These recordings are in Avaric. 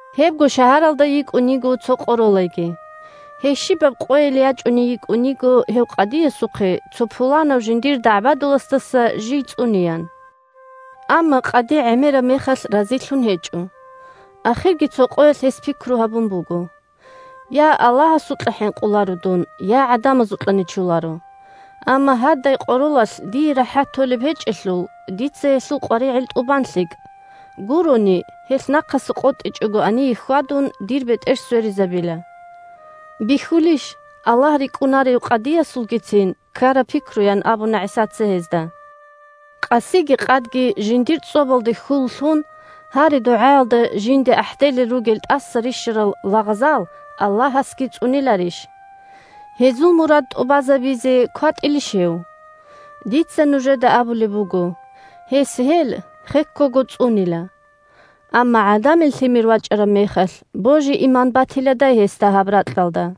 Гьебго шагьаралда йикӀун йиго цо къоролайги. Гьей щибаб къойил ячӀуней йикӀун йиго гьев къадиясухъе цо пуланав жиндир дагӀбадуласдаса жий цӀунеян. Амма къади гӀемераб мехалъ разилъун гьечӀо. Ахирги цо къоялъ гьес пикру гьабун буго: «Я Аллагьасукьа хӀинкъуларо дун, я гӀадамазукьа нечоларо. Амма гьадай къоролалъ дие рахӀат толеб гьечӀелъул, дица гьелъул къваригӀел тӀубан лъикӀ, гурони – гьелъ, нахъаса къотӀичӀого гьание хьвадун, дир бетӀер сверизабила». Бихьулищ Аллагь рикӀкӀунарев къадиясулгицин ккараб пикру? – ян абуна ГӀисаца гьезда. – Къасиги къадги жиндир цӀобалде хьул лъун, гьари-дугӀаялда жинде ахӀделел ругел тӀаса рищарал лагъзал Аллагьасги цӀуниларищ? Гьезул мурад тӀубазабизе кватӀилищ гьев? Дица нужеда абулеб буго: гьес гьел хеккого цӀунила. Амма ГӀадамил Лъимер вачӀараб мехалъ, божи-иман батиладай гьесда гьаб ракьалда?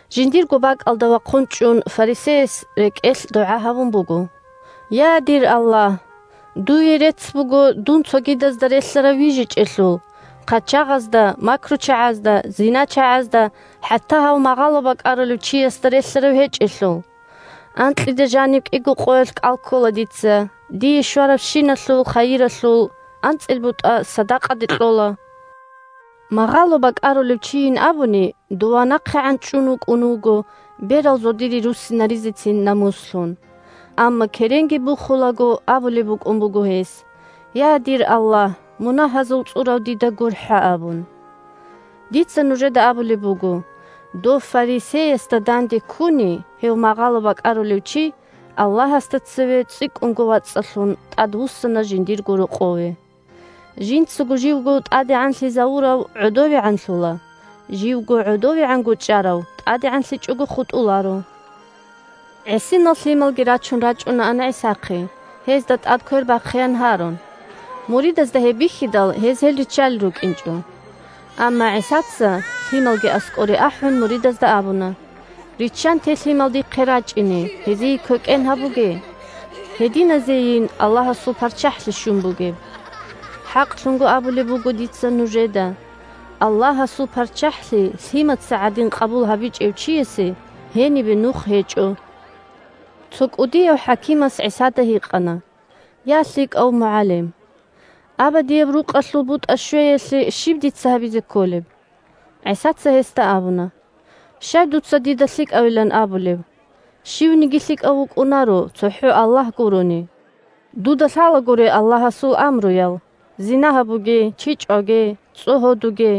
Жиндирго бакӀалда вахъун чӀун, фарисеяс рекӀелъ дугӀа гьабун буго: «Я, дир Аллагь! Дуе рецц буго дун цогидазда релълъарав вижичӀелъул; хъачагъазда, макручагӀазда, зиначагӀазда, хӀатта гьав магъало бакӀарулев чиясда релълъарав гьечӀелъул. Анкьида жаниб кӀиго къоялъ кӀал ккола дица, дие щварабщиналъул хайиралъул анцӀил бутӀа садакъаде кьола». Магъало бакӀарулев чийин абуни дова нахъегӀан чӀун вукӀун вуго, берал зодихъе руссинаризецин намуслъун. Амма, керенги бухулаго, абулеб букӀун буго гьес: «Я, дир Аллагь! Мунагьазул цӀурав дида гурхӀа!» – абун. Дица нужеда абулеб буго: дов фарисеясда данде ккуни, гьев магъало бакӀарулев чи Аллагьасда цеве цӀикӀкӀунго вацӀцӀалъун тӀадвуссана жиндирго рокъове. Жинцаго живго тӀадегӀанлъизавурав гӀодовегӀанлъула, живго гӀодовегӀанго чӀарав тӀадегӀанлъичӀого хутӀуларо. ГӀисинал лъималги рачун рачӀунаан ГӀисахъе, гьезда тӀад квер бахъеян гьарун. Муридазда гьеб бихьидал, гьез гьел риччалел рукӀинчӀо. Амма ГӀисаца, лъималги аскӀоре ахӀун, муридазда абуна: – Риччанте лъимал дихъе рачӀине, гьезие квекӀен гьабуге. Гьединазейин Аллагьасул ПарччахӀлъи щун бугеб! ХӀакълъун абулеб буго дица нужеда: Аллагьасул ПарччахӀлъи лъимаца гӀадин къабул гьабичӀев чиясе гьенибе нух гьечӀо. Цо кӀудияв хӀакимас ГӀисада гьикъана: – Я, лъикӀав МугӀалим! Абадияб рукъалъул бутӀа щвеялъе щиб дица гьабизе кколеб? ГӀисаца гьесда абуна: – Щай дуца дида лъикӀавилан абулеб? Щивниги лъикӀав вукӀунаро, цохӀо Аллагь гурони! Дуда лъалагури Аллагьасул амруял: «зина гьабуге», «чи чӀваге», «цӀогьодуге»,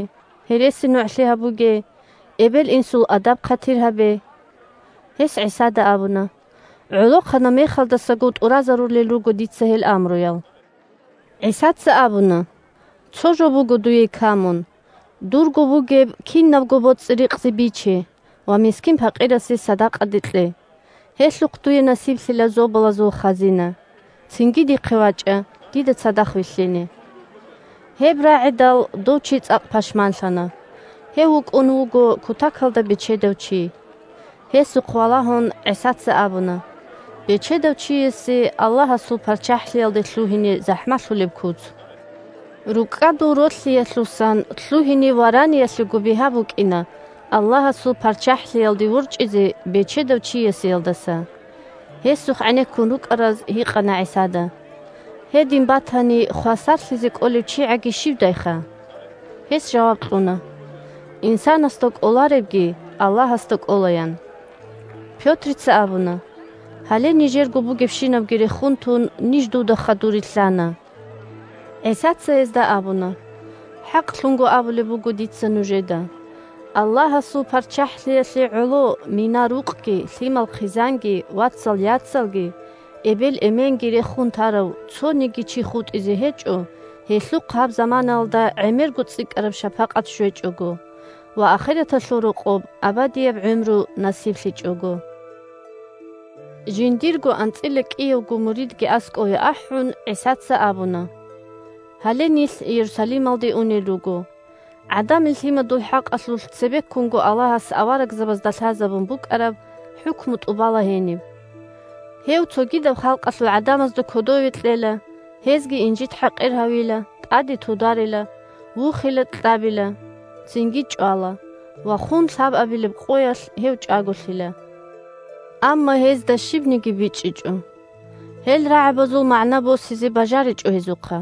«гьересинугӀлъи гьабуге», «эбел-инсул адаб-хъатир гьабе». Гьес ГӀисада абуна: – ГӀолохъанаб мехалдасаго тӀуразарулел руго дица гьел амруял. ГӀисаца абуна: – Цо жо буго дуе камун. Дурго бугеб кинабго боцӀи-рикъзи биче ва мискин-пакъирасе садакъаде кье, гьелъухъ дуе насиблъила зобалазул хазина. Цинги дихъе вачӀа, дида цадахъ вилълъине. Гьеб рагӀидал, дов чи цӀакъ пашманлъана. Гьев вукӀун вуго кутакалда бечедав чи. Гьесухъ валагьун ГӀисаца абуна: – Бечедав чиясе Аллагьасул ПарччахӀлъиялде лъугьине захӀмалъулеб куц! РукӀкӀадул ролъиялъусан лъугьине вараниялъего бигьа букӀина Аллагьасул ПарччахӀлъиялде ворчӀизе бечедав чиясеялдаса. Гьесухъ гӀенеккун рукӀараз гьикъана ГӀисада: – Гьедин батани, хвасарлъизе кӀолев чигӀаги щивдайха? Гьес жаваб кьуна: – Инсанасда кӀоларебги Аллагьасда кӀола, – ян. Пётрица абуна: – Гьале нижерго бугебщинабги рехун тун, ниж дуда хадур рилълъана… ГӀисаца гьезда абуна: – ХӀакълъун абулеб буго дица нужеда: Аллагьасул ПарччахӀлъиялъе гӀоло мина-рукъги, лъимал-хъизанги, вацал-яцалги, эбел-эменги рехун тарав цониги чи хутӀизе гьечӀо, гьелъухъ гьаб заманаялда гӀемерго цӀикӀкӀараб шапакъат щвечӀого, ва ахираталъул рокъоб абадияб гӀумру насиблъичӀого. Жиндирго анцӀила кӀиявго муридги аскӀове ахӀун, ГӀисаца абуна: – Гьале нилъ Иерусалималде унел руго. ГӀадамил Лъимадул хӀакъалъулъ цебеккунго Аллагьас аварагзабазда лъазабун букӀараб хӀукму тӀубала гьениб. Гьев цогидаб халкъалъул гӀадамазда кодове кьела, гьезги инжит-хӀакъир гьавила, тӀаде тударила, вухила-кьабила, цинги чӀвала ва хун лъабабилеб къоялъ гьев чӀаголъила. Амма гьезда щибниги бичӀчӀичӀо. Гьел рагӀабазул магӀна босизе бажаричӀо гьезухъа.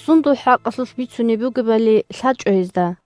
Сундул хӀакъалъулъ бицунеб бугебали лъачӀо гьезда.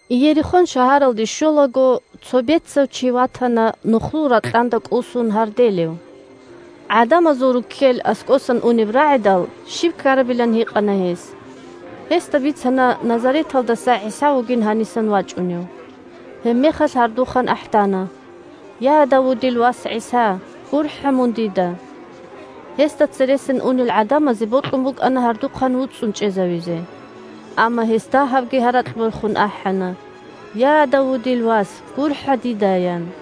Иерихон шагьаралде щолаго, цо бецав чи ватана нухлул ракьанда кӀусун гьарделев. ГӀадамазул руккел аскӀосан унеб рагӀидал, щиб ккарабилан гьикъана гьес. Гьесда бицана Назареталдаса ГӀиса вугин гьанисан вачӀунев. Гьебмехалъ гьардухъан ахӀдана: – Я, Давудил вас ГӀиса! ГурхӀа мун дида! Гьесда цересан унел гӀадамазе бокьун букӀана гьардухъан вуцӀцӀун чӀезавизе. Амма гьес дагьабги гьаракь борхун ахӀана: – Я, Давудил вас! ГурхӀа дида! – ян.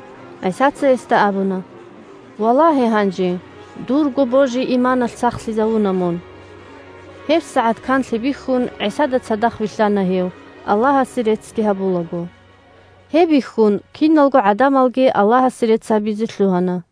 ГӀисаца гьесда абуна: – Валагье гьанже! Дурго божи-иманалъ сахлъизавуна мун. ГьебсагӀат канлъи бихьун, ГӀисада цадахъ вилълъана гьев, Аллагьасе реццги гьабулаго. Гьеб бихьун, киналго гӀадамалги Аллагьасе рецц гьабизе лъугьана.